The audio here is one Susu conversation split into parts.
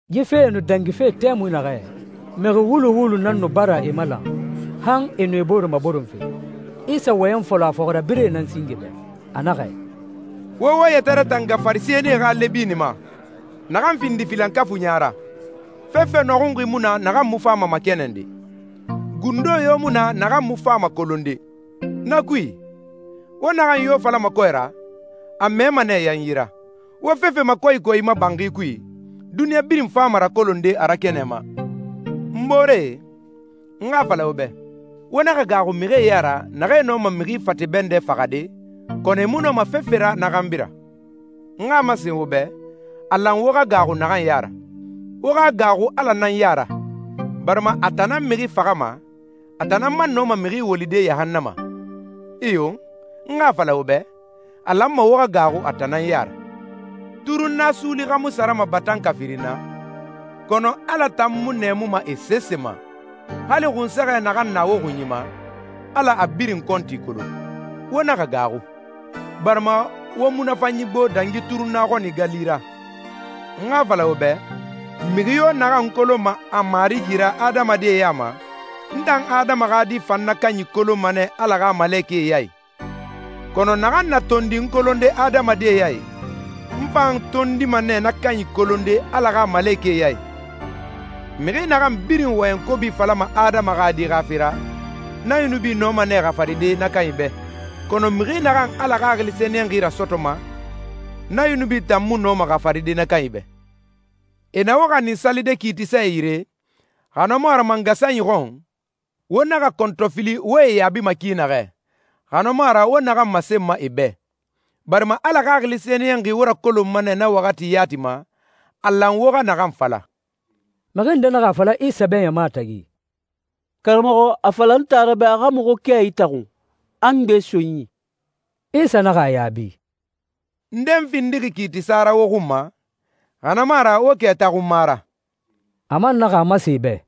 Yi fee nu dangife tɛmui naxɛ, mixi wulu wulu nan nu bara e malan, han e nu e bore maboronfe. Isa wɔyɛn fɔlɔ a fɔxirabirɛe nan singe bɛ, a naxɛ, «Wo wo yɛtɛ ratanga Farisɛnie xa lɛbini ma, naxan findixi filankafuiɲa ra. Fefe nɔxunxi mu na naxan mu fama makɛnɛnde, gundo yo mu na naxan mu fama kolonde. Na kui, wo naxan yo falama kɔɛ ra, a mɛma nɛ yanyi ra. Wo fefe makɔyikɔyima banxi kui, duniɲa birin fama rakolonde a ra kɛnɛ ma.» «N booree, n xa a fala wo bɛ, wo naxa gaaxu mixie ya ra naxee nɔma mixi fate bɛndɛ faxade, kɔnɔ e mu nɔma fefe ra na xanbi ra. N xa a masen wo bɛ, a lan wo xa gaaxu naxan ya ra. Wo xa gaaxu Ala nan ya ra, barima a tan nan mixi faxama, a tan nan man nɔma mixi wolide yahannama. Iyo, n xa a fala wo bɛ, a lanma wo xa gaaxu a tan nan ya ra.» «Turunna suuli xa mu sarama batanka firin na? Kɔnɔ Ala tan mu nɛɛmuma e sese ma. Hali xunsɛxɛ naxan na wo xunyi ma, Ala a birin kɔnti kolon. Wo naxa gaaxu, barima wo munafanyi gbo dangi turunna xɔni gali ra.» «N xa a fala wo bɛ, mixi yo naxan n kolonma a Marigi ra adamadie ya ma, n tan Adama xa Di fan na kanyi kolonma nɛ Ala xa malekɛe ya i. Kɔnɔ naxan na tondi n kolonde adamadie ya i, n fan tondima nɛ na kanyi kolonde Ala xa malekɛe ya i.» «Mixi naxan birin wɔyɛn kobi falama Adama xa Di xa fe ra, na yunubi nɔma nɛ xafaride na kanyi bɛ, kɔnɔ mixi naxan Ala Xaxili Sɛniyɛnxi rasɔtɔma, na yunubi tan mu nɔma xafaride na kanyi bɛ.» «E na wo xanin salide kiitisae yire, xa na mu a ra mangasanyi xɔn, wo naxa kɔntɔfili wo e yaabima ki naxɛ, xa na mu a ra wo naxan masenma e bɛ, barima Ala Xaxili Sɛniyɛnxi wo rakolonma nɛ na waxati yati ma, a lan wo xa naxan fala.» Mixi nde naxa a fala Isa bɛ ɲama tagi, «Karamɔxɔ, a fala n taara bɛ a xa muxu kɛ itaxun, a n gbe so n yi.» Isa naxa a yaabi, «Nde n findixi kiitisa ra wo xun ma, xa na mu a ra wo kɛ taxunma ra?» A man naxa a masen e bɛ,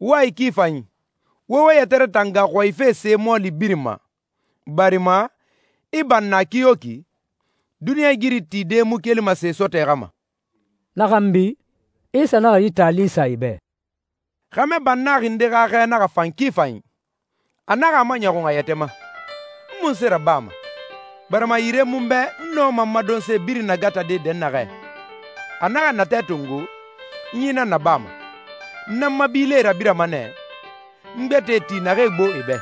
«Wo a i ki fanyi, wo wo yɛtɛ ratanga xɔyife se mɔɔli birin ma, barima i banna kiyoki, duniɲɛigiri tide mu kelima se sɔtɔɛ xa ma.» Na xanbi, Isa naxa yi taali sa e bɛ, «Xɛmɛ bannaxi nde xa xɛ naxa fan ki fanyi. A naxa a maɲɔxun a yɛtɛ ma, ‹N munse rabama, barima yire mu n bɛ n nɔma n ma donse birin nagatade dɛnnaxɛ?› A naxa natɛ tongo, ‹N yi nan nabama. N na n ma bilie rabirama nɛ, n gbɛtɛe ti naxee gbo e bɛ.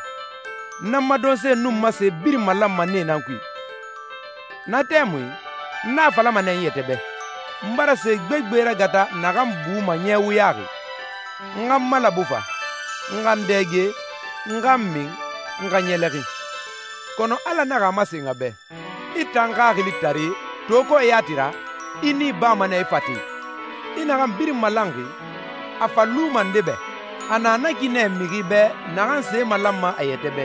N na n ma donse nun n ma se birin malanma nee nan kui. Na tɛmui n na a falama nɛ n yɛtɛ bɛ, N bara se gbegbe ragata naxan buma ɲɛ wuyaxi. N xa n malabu fa, n xa n dɛge, n xa n min, n xa ɲɛlɛxin.› Kɔnɔ Ala naxa a masen a bɛ, ‹I tan xaxilitare! To kɔɛ yati ra, i nii bama nɛ i fate. I naxan birin malanxi, a fa luma nde bɛ?› A na na ki nɛ mixi bɛ naxan se malanma a yɛtɛ bɛ,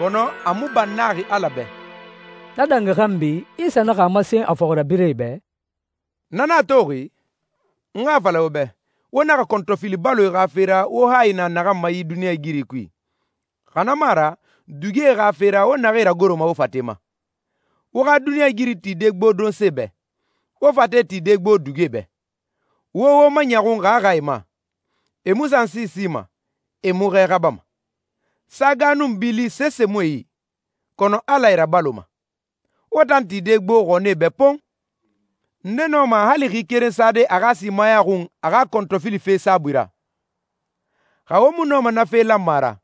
kɔnɔ a mu bannaxi Ala bɛ.» Na dangi xanbi Isa naxa a masen a fɔxirabirɛe bɛ, «Na nan a toxi, n xa a fala wo bɛ, wo naxa kɔntɔfili baloe xa fe ra wo hayi na naxan ma yi duniɲɛigiri kui, xa na mu a ra, dugie xa fe ra wo naxee ragoroma wo fate ma. Wo xa duniɲɛigiri tide gbo donse bɛ, wo fate tide gbo dugie bɛ. Wo wo maɲɔxun xaaxae ma. E mu sansi sima, e mu xɛ xabama. Saga nun bili sese mu e yi, kɔnɔ Ala e rabaloma. Wo tan tide gbo xɔnie bɛ pon! Nde nɔma hali xi keren sade a xa simaya xun a xa kɔntɔfilife saabui ra? Xa wo mu nɔma na fe lanma ra,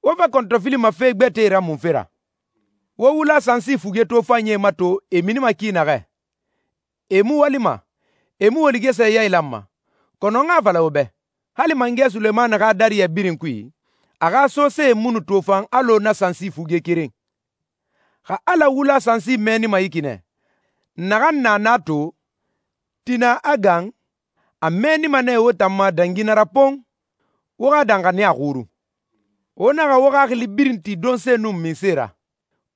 wo fa kɔntɔfilima fe gbɛtɛe ra munfe ra?» «Wo wula sansi fuge tofanyie mato e minima ki naxɛ. E mu walima, e mu woligɛsɛ yailanma, kɔnɔ n xa a fala wo bɛ, hali mangɛ Sulemani xa dariyɛ birin kui, a xa sosee mu nu tofan alɔ na sansi fuge keren. Xa Ala wula sansi mɛɛnima yi ki nɛ, naxan na na to, tina a gan, a mɛɛnima nɛ wo tan ma dangi na ra pon! Wo xa danxaniya xurun. Wo naxa wo xaxili birin ti donse nun minse ra.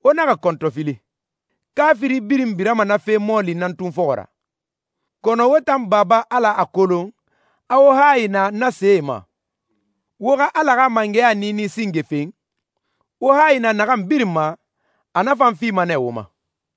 Wo naxa kɔntɔfili. Kaafiri birin birama na fe mɔɔli nan tun fɔxɔ ra. Kɔnɔ wo tan Baba Ala a kolon, a wo hayi na na see ma. Wo xa Ala xa mangɛya niini singe fen. Wo hayi na naxan birin ma, a na fan fima nɛ wo ma.»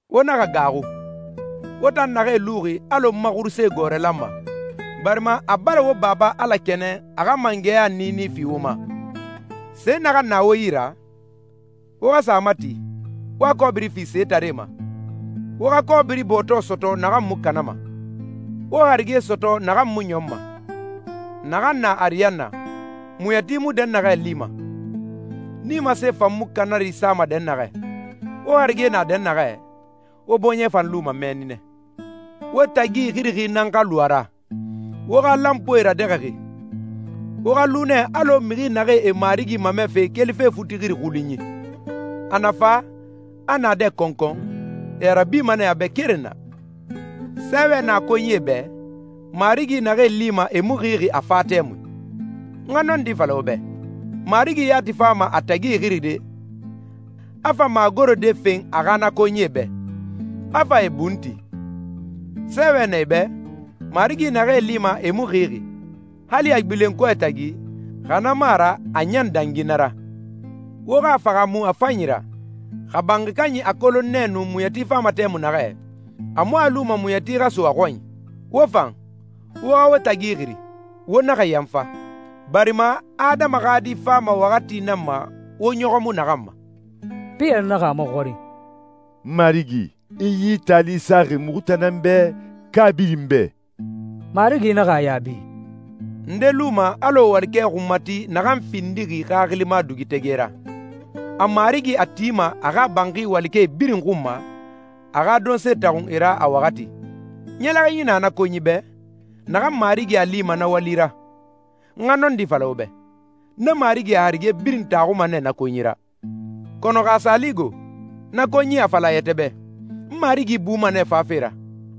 «Wo naxa gaaxu, wo tan naxee luxi alɔ n ma xuruse gɔɔrɛ lanma, barima a bara wo Baba Ala kɛnɛn a xa mangɛya niini fi wo ma. Se naxan na wo yi ra, wo xa sa a mati, wo a kɔbiri fi setaree ma. Wo xa kɔbiri bɔɔtɔ sɔtɔ naxan mu kanama, wo harige sɔtɔ naxan mu ɲɔnma, naxan na ariyanna, muɲɛti mu dɛnnaxɛ lima, nimasee fan mu kanari sama dɛnnaxɛ. Wo harige na dɛnnaxɛ, wo bɔɲɛ fan luma mɛnni nɛ.» «Wo tagi ixirixi nan xa lu a ra, wo xa lanpuie radɛxɛxi. Wo xa lu nɛ alɔ mixi naxee e marigi mamɛfe kelife futixiri xulunyi. A na fa, a naadɛ kɔnkɔn, e a rabima nɛ a bɛ keren na. Sɛɛwɛ na konyie bɛ, marigi naxee lima e mu xixi a fa tɛmui. N xa nɔndi fala wo bɛ, marigi yati fama a tagi ixiride, a fa magorode fen a xa na konyie bɛ, a fa e bun ti. Sɛɛwɛ na e bɛ, marigi naxee lima e mu xixi, hali a gbilen kɔɛ tagi, xa na mu a ra a ɲan dangi na ra.» «Wo xa a fahaamu a fanyi ra, xa banxi kanyi a kolon nɛ nu muɲɛti fama tɛmui naxɛ, a mu a luma muɲɛti xa so a xɔnyi. Wo fan, wo xa wo tagi ixiri, wo naxa yanfa, barima Adama xa Di fama waxati nan ma wo ɲɔxɔ mu naxan ma.» Piyɛri naxa a maxɔrin, «Marigi, i yi taali saxi muxu tan nan bɛ, ka birin bɛ?» Marigi naxa a yaabi, «Nde luma alɔ walikɛ xunmati naxan findixi xaxilima dugutɛgɛ ra? A marigi a tima a xa banxi walikɛe birin xun ma, a xa donse taxun e ra a waxati. Ɲɛlɛxinyi na na konyi bɛ, naxan marigi a lima na wali ra. N xa nɔndi fala wo bɛ, na marigi a harige birin taxuma nɛ na konyi ra. Kɔnɔ xa a sa li go, na konyi a fala a yɛtɛ bɛ, ‹N marigi buma nɛ fafe ra›,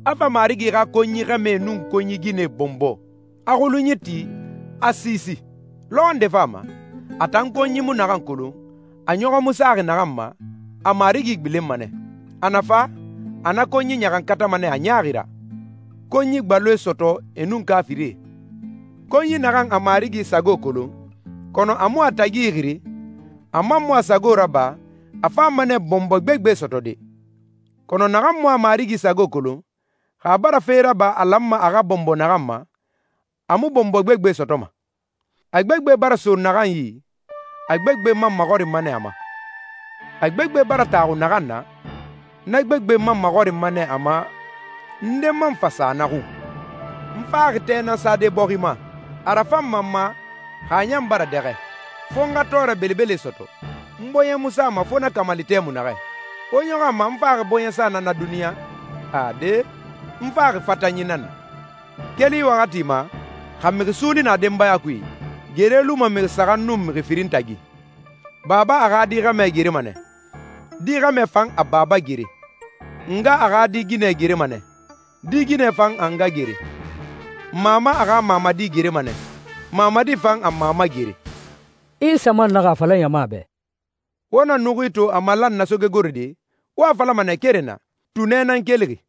a fa marigi xa konyi xɛmɛe nun konyi ginɛe bɔnbɔ, a xulunyi ti, a siisi? Lɔxɔ nde fama, a tan konyi mu naxan kolon, a ɲɔxɔ mu saxi naxan ma, a marigi gbilenma nɛ. A na fa, a na konyi ɲaxankatama nɛ a ɲaaxi ra, konyi gbaloe sɔtɔ e nun kaafirie.» «Konyi naxan a marigi sago kolon, kɔnɔ a mu a tagi ixiri, a man mu a sago raba, a fama nɛ bɔnbɔɛ gbegbe sɔtɔde. Kɔnɔ naxan mu a marigi sago kolon, xa a bara fe raba a lanma a xa bɔnbɔ naxan ma, a mu bɔnbɔɛ gbegbe sɔtɔma. A gbegbe bara so naxan yi, a gbegbe man maxɔrinma nɛ a ma. A gbegbe bara taxu naxan na, na gbegbe man maxɔrinma nɛ a ma, nde man fa sa na xun.» «N faxi tɛ nan sade bɔxi ma. A rafanma n ma xa a ɲan bara dɛxɛ! Fo n xa tɔɔrɛ belebele sɔtɔ. N bɔɲɛ mu sama fo na kamali tɛmui naxɛ. Wo ɲɔxɔ a ma a n faxi bɔɲɛsa nan na duniɲa? Ade, n faxi fatanyi nan na. Keli yi waxati ma, xa mixi suuli na denbaya kui, gere luma mixi saxan nun mixi firin tagi. Baba a xa di xɛmɛ gerema nɛ, di xɛmɛ fan a baba gere. Nga a xa di ginɛ gerema nɛ, di ginɛ fan a nga gere. Mama a xa mamadi gerema nɛ, mamadi fan a mama gere.» Isa man naxa a fala ɲama bɛ, «Wo na nuxui to a malan na sogegorode, wo a falama keren na, ‹Tunɛ nan kelixi,›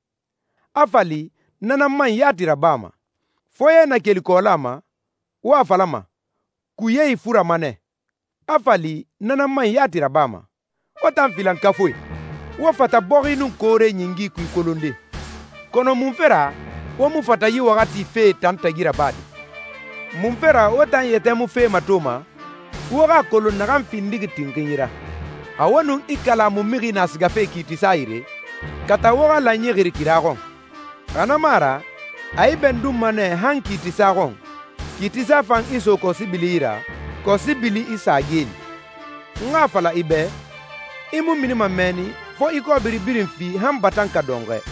a fa li na nan man yati rabama. Foye na keli kɔɔla ma, wo a falama, ‹Kuye ifurama nɛ,› a fa li na nan man yati rabama. Wo tan filankafuie! Wo fata bɔxi nun koore ɲingi kui kolonde, kɔnɔ munfe ra wo mu fata yi waxati fee tan tagi rabade?» «Munfe ra wo tan yɛtɛ mu fe matoma, wo xa a kolon naxan findixi tinxinyi ra? Xa wo nun i kalamu mixi na sigafe kiitisa yire, kata wo xa lanyi xiri kira xɔn, xa na mu a ra a i bɛndunma nɛ han kiitisa xɔn, kiitisa fan i so kɔsibili yi ra, kɔsibili i sa geeli. N xa a fala i bɛ, i mu minima mɛnni fo i kɔbiri birin fi han batanka dɔnxɔɛ.»